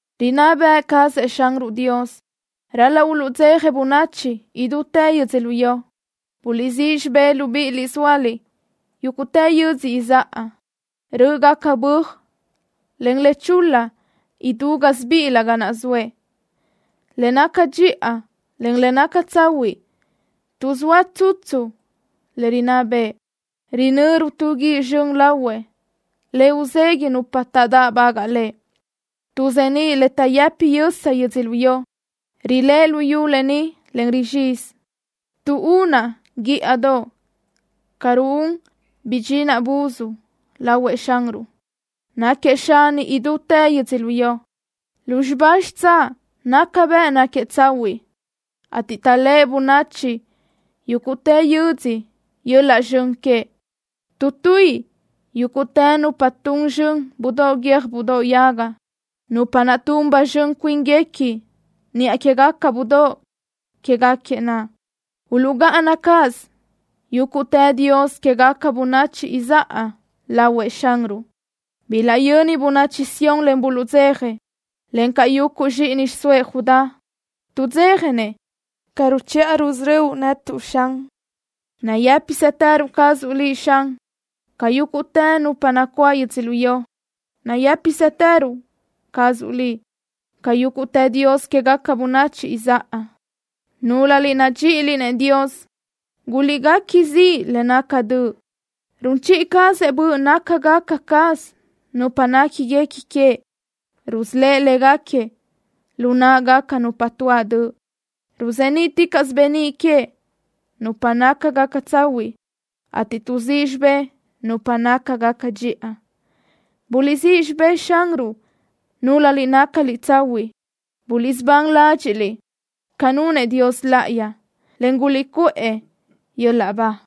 ¡Rinná bëʼ cazëʼ Xanruʼ Dios! ¡Ral-laʼ uluʼdzeja bönachi idútë yödzölió! Buliʼsíʼ xibë́ʼ, libíʼiliʼ zóaliʼ yúguʼtë yödzö izáʼa. Rö́ʼgaca böaj, en le chul-la idú gásibiʼilö ga naʼ zoëʼ. Le naca dxiʼa, en le naca tsahuiʼ tuʼzóa tsutsu le rinná bëʼë. Rinöru tu guíʼ zxön lahuëʼ, le uzeguiʼ nupa taʼdáʼbagaʼ Lëʼ. Tuʼzeníʼ le taʼyëpi yösa yödzölió. Riléʼe luyú lë ni, en rizxizi. Tuʼúnaʼ guíʼadoʼ ca ruún bidxinaʼ buz lahuëʼ Xanruʼ. Náquiëʼ Xani idútë yödzölió. Lúzxiba xitsáʼ naca bëʼ náquiëʼ tsahuiʼ, ateʼ taʼléʼe bönachi yúguʼtë yödzö yöl-laʼ zxön queëʼ. Tuʼtuíʼi yúguʼtë nupa tun zxön budóʼ guiö́j budóʼ yaga, nupa naʼ tun ba zxön cuínguequi niʼa quégaca budóʼ quéguequi naʼ. Uluʼgáʼana cáʼasö yúguʼtë dios quégaca bönachi izáʼa lahuëʼ Xanruʼ. Bilaʼyöni bönachi Sión, en buluʼdzeja, encaʼ yuguʼ zxíʼini xiʼsóëʼ Judá. Tuʼdzéjanëʼ ca ruchiʼa rusörö́uʼ netuʼ, Xan. Nayë́pisëtërö cazuʼ Liʼ, Xan, ca yúguʼtë nupa nacuáʼ yödzölió. Nayë́pisëtërö cazuʼ Liʼ ca yúguʼtë dios quégaca bönachi izáʼa. Núlöliʼ nadxíʼiliʼ-nëʼ Xanruʼ, guliʼguequi ziʼ le naca döʼ. Run chiʼi cazëʼ böʼ nácagaca caz nupa néquiguequi queëʼ. Rusölë́ʼ léguequi lu náʼagaca nupa tuáʼ döʼ. Ruzeníʼticaʼsö beníʼ queëʼ nupa nácagaca tsahuiʼ, ateʼ tuʼzíʼ xibë́ʼ nupa nácagaca dxiʼa. ¡Buliʼsíʼ xibë́ʼ Xanruʼ núlöliʼ nácaliʼ tsahuiʼ! ¡Buliʼsubán ládxiʼliʼ ca nunëʼ Dios Láʼayi, en guliʼcuʼë yöl-laʼ ba!